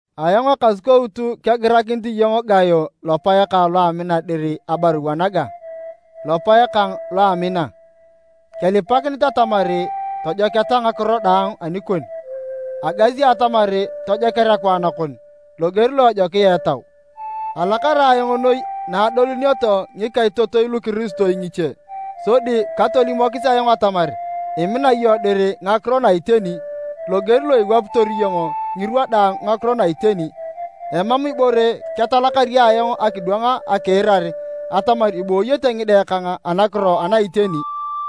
Ayong Ekasukout kegirakinit iyong Gayo lopae kang lo amina dir abarua naga. Lopae kang lo amina, kelipakinit atamar tojoketa ngakiro daang anikon, agasi atamar tojoker akwaan kon, loger lo ejokia etau. Alakar ayong noi na adolunioto ngikaitotoi lukiristoi ngiche sodi katolimokis ayong atamar imina iyong dir ngakiro na iteni, loger lo iwapitor iyong ngirwa daang ngakiro na iteni. Emam ibore ketalakari ayong akidwang akiirar atamar ibooyete ngide kang anakiro ana iteni.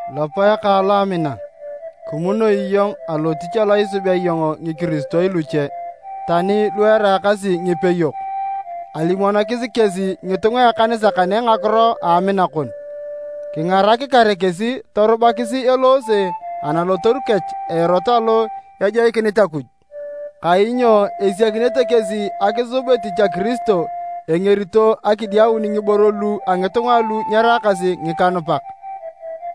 Lopae kang lo amina, kimunoi iyong alotich alo isubea iyong ngikiristoi luche, tani lu eraakasi ngipeyok. Alimonokis kesi ngitunga a ekanisa kane ngakiro a amina kon. Kingarak kare kesi torubakis eloose analotoru kech a erot alo ejoikinit Akuj. Kainyo esiakinete kesi akisub etich a Kiristo engerito akidiaun ngiboro lu a ngitunga alu nyeraakasi ngikanupak.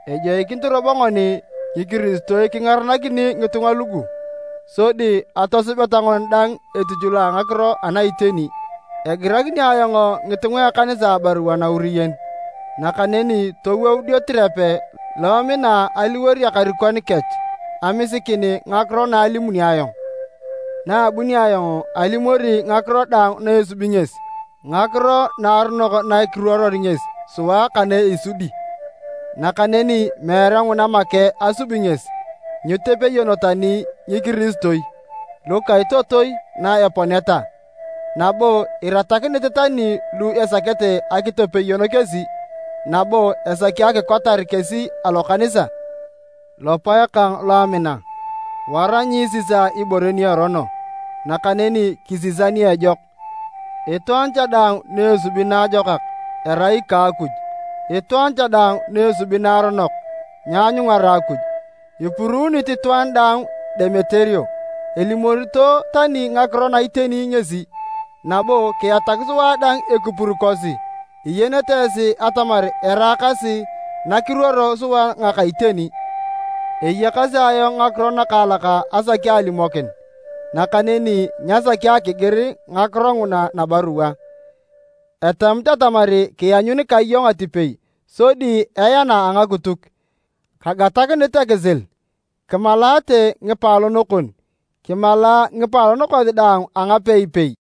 Ejoikinit robo ngoni ngikiristoi kingarakini ngitunga lugu, sodi atosubeta ngoni dang etich lo a ngakiro ana iteni. Egirakini ayong ngitunga a ekanisa abarua nauriyen, nakaneni towou Diotirepe lo emina aliwor ekarikon kech amisikin ngakiro na alimuni ayong. Na abunio ayong, alimori ngakiro daang na esubi ngesi, ngakiro naaronok na kiruoror ngesi sua ka na isudi! Nakaneni meere nguna make asubi ngesi, nyitopeyoni tani ngikiristoi lukaitotoi na eponeta, nabo iratakinit tani lu esakete akitopeyon kesi, nabo esaki akikotar kesi alokanisa! Lopae kang lo amina, wara nyiisisa ibore ni erono, nakaneni kisisa ni ejok. Itwaan cha daang ni esubi naajokak erai ika Akuj, itwaan cha daang ni esubi naaronok nyeanyungara Akuj. Ipuruunit itwaan daang Demeterio, elimorito tani ngakiro na iteni ngesi. Nabo kiatak sua dang ekipur kosi, iyenete esi atamar eraakasi na kiruoro sua ngaka iteni. Eyakasi ayong ngakiro nakaalak asaki alimokin, nakaneni nyasaki akigir ngakiro nguna nabarua. Etamit atamar kianyun ka iyong atipei sodi eana a ngakituk. Kagatakinit ekisil. Kimalaate ngipaalon kon. Kimala ngipaalon kosi daang a ngapeipei.